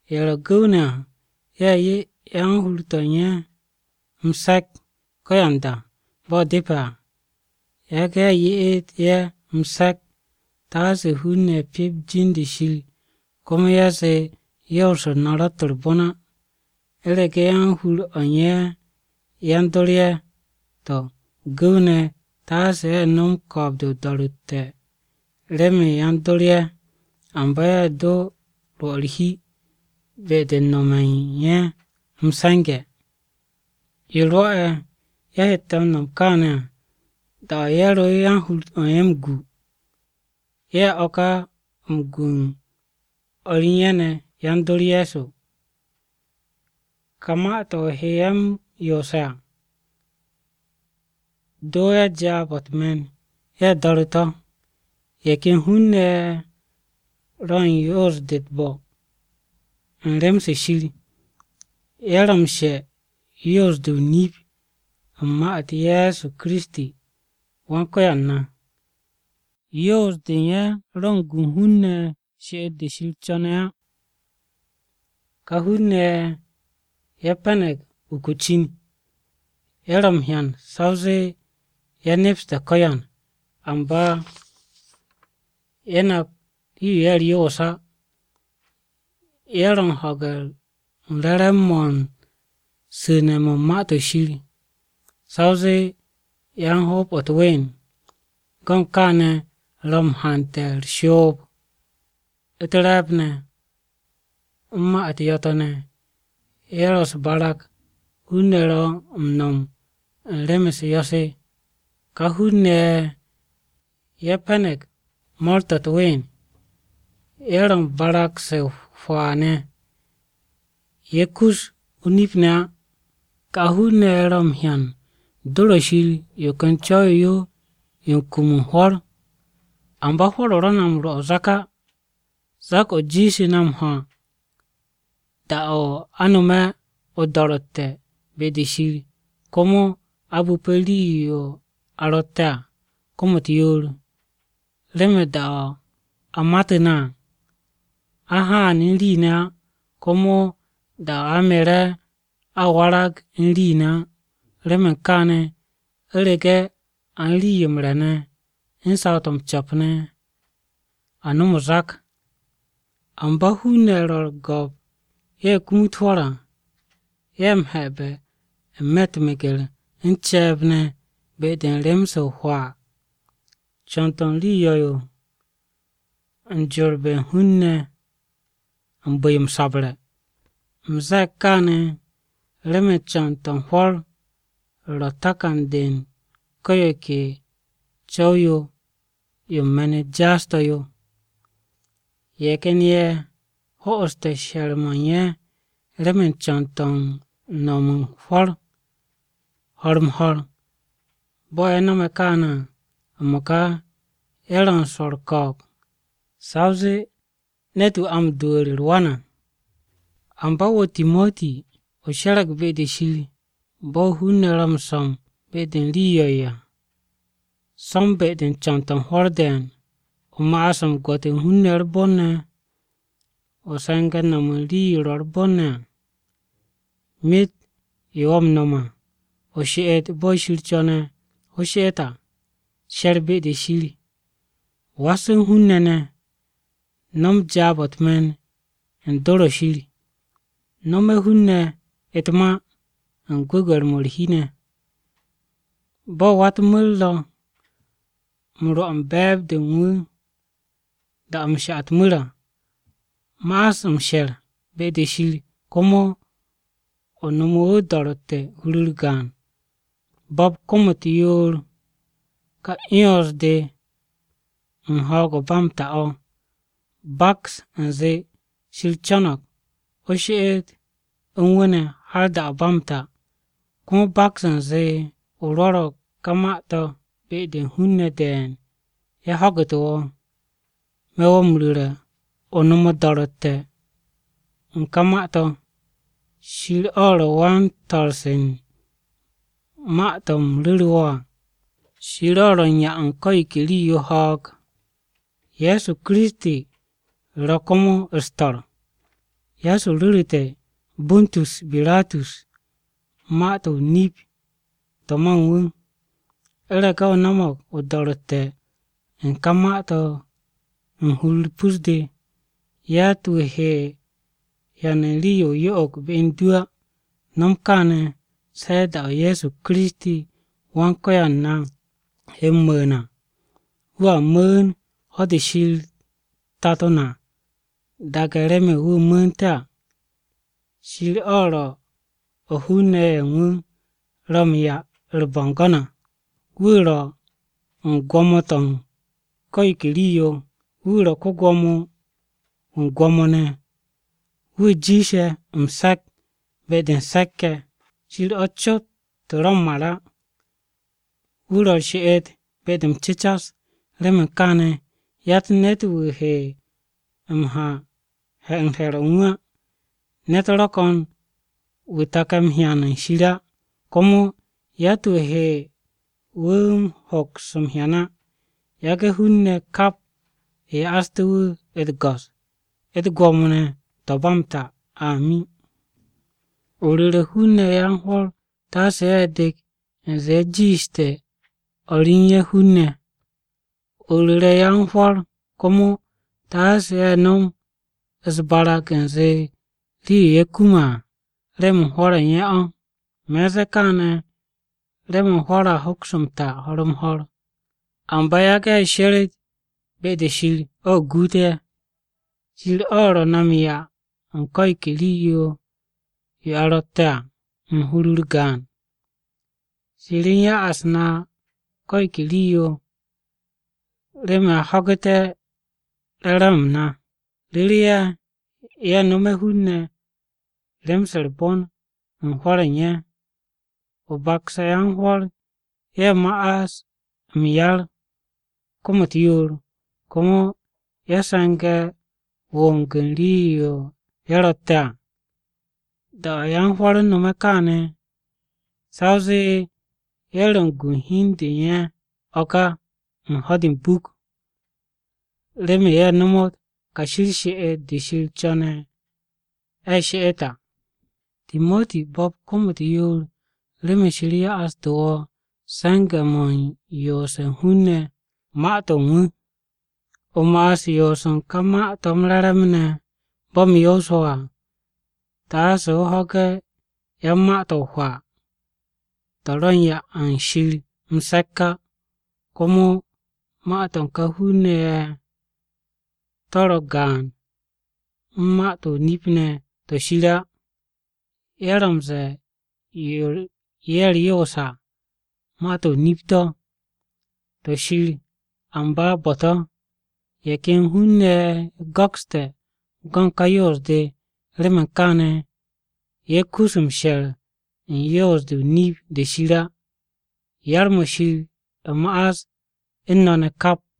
Ye̱ ro̱ gu̱w-ne̱ à, ye̱ 'ye yan-hur-o̱ u̱n ye̱ m-se̱k ko̱yanda bo̱ depe̱ à. Yage̱ ye̱ ye'et ye̱ m-se̱k taase hun-ne̱ pyep jin-de Shir, komo ye̱ zee yoos-u̱r na ro̱tt u̱r-bon á. U̱rege̱ yan-hur-o u̱n ye̱ yan-dor ye̱, to̱ gu̱w-ne̱ taase ye̱ nom ko̱o̱b-de o-do̱ro̱tte̱ remen yan-dor ye̱. Amba ye̱ do̱ rwo̱ u̱r-hi be-de u̱n nome̱ u̱n ye̱ m-se̱nge̱. Yo rwo̱'e̱ ye̱ hette̱ m-no̱m kaane̱ à, da-o̱ ye̱ ro yan-hur-o̱ u̱n ye̱ m-gu, ye̱ o̱ ka m-gu u̱n o̱r ye̱ ne̱ yan-dor Ye̱so. Ka ma-to̱ o he ye̱ m-yoose̱ à, o do ye̱ jaab-o̱ u̱t-me̱n ye̱ do̱re̱ to̱. Ye̱ ken hun-ne̱ ye̱ ro̱ u̱n yoos-de u̱t-bo̱ u̱n rem-se Shir. Ye̱ ro̱ m-she u̱n yoos-de o-nip u̱n ma-u̱t Ye̱so Kiristi ne̱, Wan-Ko̱yan na. Yoos-de u̱n ye̱ ro̱ u̱n gu u̱n hun-ne̱ she'et-de Shir co̱ne̱ á. Ka hun-ne̱ ye̱ pe̱ne̱g uku o-cin. Ye̱ ro̱ m-hyan sa o zee ye̱ nepse̱ ko̱yan, amba ye̱ nap rii-yo ye̱ u̱r-yoos á. Ye̱ ro̱ u̱n ho̱ge̱ u̱n re̱re̱m-mo̱ u̱n su̱ne̱-mo̱ u̱n Ma-to̱ Shir, sa o zee yan-hoob-o̱ u̱t-ween. Go̱ u̱n kaane̱ ro̱ m-hante̱ u̱r-shoob, u̱t-re̱e̱b ne̱, u̱n ma-u̱t yo̱-to̱ ne̱, ye̱ ro̱ u̱s-barag hun-ne̱ ro̱ u̱n no̱m u̱n rem-u̱s yo̱-se. Ka hun-ne̱ ye̱ pe̱ne̱g mo̱o̱r-to̱ u̱t-ween. Ye̱ ro̱ u̱n barag-se o-hwaa ne̱, ye̱ kus o-nip ne̱ á. Ka hun-ne̱ ye̱ ro̱ m-hyan do̱r-o̱ Shir yo ken co̱w-yo yo, yo u̱n kum u̱n hwo̱r. Amba hwo̱r-o ro̱ na m-rwo̱ o-zak á. Zak-o jiishte̱ na m-ho̱, da-o̱ a no̱me̱ o-do̱ro̱tte̱ be-de Shir, komo a bu̱pe̱ rii-yo a ro̱tte̱ à kom-u̱t yoor. Remen da-o̱ a matu̱ na à, a haan u̱n rii ne̱ á, komo da-o̱ a mere̱, a warag u̱n rii ne̱ á. Remen kaane̱, u̱rege̱ a u̱n rii-yo m-re̱ ne̱ u̱n saw-to̱ m-co̱p ne̱, a nom o-zak. Amba hun-ne̱ ye̱ ro̱ u̱r-go̱p ye̱ kumut hwo̱r à, ye̱ m-he̱be̱ n-me̱ u̱t-meger u̱n ce̱e̱b ne̱ be-de u̱n rem-se o-hwaa. Co̱n-to̱ u̱n rii yo̱-yo ro̱ u̱n jorbe̱ u̱n hun-ne̱ u̱n bu̱-yo m-sabre̱. U̱m ze̱e̱g kaane̱ remen co̱n-to̱ u̱n hwo̱r ro̱ takan-de u̱n ko̱ yo ke co̱w-yo yo u̱n me̱n-u̱t jaas-to̱ yo. Ye̱ ken ye̱ ho'oste̱ she̱r-mo̱ u̱n ye̱ remen co̱n-to̱ u̱n nom u̱n hwo̱r ho̱r-m-ho̱r. Bo̱ ye̱ no̱me̱ kaane̱ à, m-mo̱ka ye̱ ro̱ u̱n swo̱ u̱r-ko̱o̱b, sa o zee ne̱t-wu̱ a m-dwu̱u̱re̱ u̱r-wan à. Amba wo̱ Timoti o she̱re̱g be-de Shir. Bo̱ hun-ne̱ ro̱ m-so̱m be-de u̱n rii yo̱-yo à, so̱m be-de u̱n co̱n-to̱ u̱n hwo̱r de̱e̱n. O ma'as m-gwo̱t u̱n hun-ne̱ u̱r-bon ne̱. O se̱nge̱ no̱m u̱n rii-yo ro̱ u̱r-bon ne̱ à. Myet yo wo̱ m-no̱m à, she'et bo̱ Shir co̱ne̱ o she'et à. She̱r be-de Shir. Was u̱n hun-ne̱ ne̱. No̱m jaab-o̱ u̱t-me̱n u̱n dor-o̱ Shir. Nome̱ hun-ne̱ u̱t-ma u̱n gwu̱gwe̱r-mo̱ u̱r-hi ne̱. Bo̱ wa-u̱t-mu̱r ro̱ m-rwo̱ u̱n be̱e̱b-de u̱n wu̱ da-o̱ m-sha u̱t-mu̱r à, ma'as m-she̱r be-de Shir komo o nome̱ wu̱ o-do̱ro̱tte̱ hur-u̱r gaan. Bo̱p kom-u̱t yoor ka 'yons-de u̱n ho̱o̱g o̱ ba m-ta o̱. Baks u̱nze Shir co̱no̱g o she'et u̱n wu̱ ne̱ har da-o̱ ba m-ta. Komo baks u̱nze o rwo̱ro̱g ka ma-to̱ be-de u̱n hun-ne̱ de̱e̱n ye̱ ho̱gu̱tu̱ wo̱. Me̱ wo̱ m-ru̱re̱ o nom o-do̱ro̱tte̱ u̱n ka ma-to̱. Shir o̱ ro̱ wan-to̱rse u̱n ma-to̱ u̱m ru̱ru̱ wo̱ à. Shir o̱ ro̱ u̱n 'ya u̱n ko̱ yo ke rii-yo ho̱o̱g. Ye̱so Kiristi ro̱ komo u̱s-to̱r. Ye̱so ru̱ru̱te̱ Panti Biratus ma-to̱ o-nip to̱ ma u̱n wu̱. U̱rege̱ o no̱mo̱g o-do̱ro̱tte̱ u̱n ka ma-to̱ u̱n hur-u̱r pus-de, yatt-wu̱ he hyan u̱n rii-yo o-yo'og be u̱n du á. Nom kaane̱ se da-o̱ Ye̱so Kiristi Wan-Ko̱yan na he m-mu̱u̱n à. Wu̱a mu̱u̱n ho̱-de Shir Tato na daage̱ remen wu̱ mu̱u̱nte̱ à. Shir o̱ ro̱ o̱ hun-ne̱ ye̱ u̱n wu̱ ro̱ wu̱ m-'ya u̱r-bo̱ngo̱n à. Wu̱ ro̱ u̱n gwo̱mo-to̱ u̱n ko̱ yo ke rii-yo. Wu̱ ro̱ ko-Gwo̱mo-wu̱ u̱n gwo̱mo ne̱, wu̱ jiishe̱ m-se̱k be-de u̱n se̱k-ye̱. Shir o̱ cot ro̱ m-mar á. Wu̱ ro̱ u̱r-she'et be-de m-cecar. Remen kaane̱ yatt ne̱t-wu̱ he m-ha u̱n he̱r-o̱ u̱n wu̱ á. Ne̱t ro̱ ko̱n wu̱ take̱ m-hyan u̱n Shir á, komo yatt-wu̱ he wu̱ hoks m-hyan á. Yage̱ hun-ne̱ kap ya'aste̱ wu̱ u̱t-go̱s, u̱t-gwo̱mo ne̱, to̱ ba m-ta. Amin. O ru̱re̱ hun-ne̱ yan-hwo̱r taase ye̱ de̱k u̱nze ye̱ jiishte̱ o̱r u̱n ye̱ hun-ne̱. O ru̱re̱ yan-hwo̱r komo taase ye̱ nom u̱s-barag u̱nze rii-yo ye̱ kume̱ à, remen hwo̱r u̱n ye̱ o̱. Me̱ u̱n ze̱e̱ kaane̱ remen hwo̱r a hoks m-ta ho̱r-m-ho̱r. Amba yage̱ ye̱ sheret be-de Shir o̱ guut ye̱. Shir o̱ ro̱ na m-'ya u̱n ko̱ yo ke rii-yo yo a ro̱tte̱ à, u̱n hur-u̱r gaan. Shir u̱n ya'as na ko̱ yo ke rii-yo remen a ho̱gu̱te̱ re̱re̱m-m na. Ru̱re̱ ye̱, ye̱ nome̱ hun-ne̱ rem-se u̱r-bon u̱n hwo̱r u̱n ye̱. O bakse̱ yan-hwo̱r ye̱ ma'as m-yar kom-u̱t yoor, komo ye̱ se̱nge̱ wong u̱n rii-yo ye̱ ro̱tte̱ à. Da-o̱ yan-hwo̱r nome̱ kaane̱, sa o zee ye̱ ro̱ u̱n gu u̱n hi u̱n de u̱n ye̱ o̱ ka u̱n ho̱-de m-buk, remen ye̱ she'ette̱ kashi u̱r-she'et de Shir co̱ne̱ a she'et à. Timoti, bo̱p kom-u̱t yoor remen Shir ya'astu̱ wo̱ se̱nge̱-mo̱ u̱n yoose̱ u̱n hun-ne̱ Ma-to̱ u̱n wu̱. O ma'as u̱n yoos u̱n ka Ma-to̱ m-Re̱re̱m ne̱ bo̱ u̱m yoose̱ wo̱ à. Taase o ho̱ge̱ yan-ma-to̱ o-hwaa. To̱ ro̱ u̱n 'ya u̱n Shir m-se̱k á, komo ma-to̱ u̱n ka hun-ne̱ ye̱ to̱ ragaan u̱n ma-to̱ o-nip ne̱ to̱ Shir á. Ye̱ ro̱ m-ze̱e̱ yo ye̱ u̱r-yoos à, ma-to̱ o-nip to̱, to̱ Shir, amba bo̱-to̱. Ye̱ ken hun-ne̱ ye̱ go̱kste̱ go̱n ka yoos-de. Remen kaane̱, ye̱ kus m-she̱r u̱n yoos-de o-nip de Shir á. Yar-mo̱ Shir ma'as u̱n no̱ ne̱!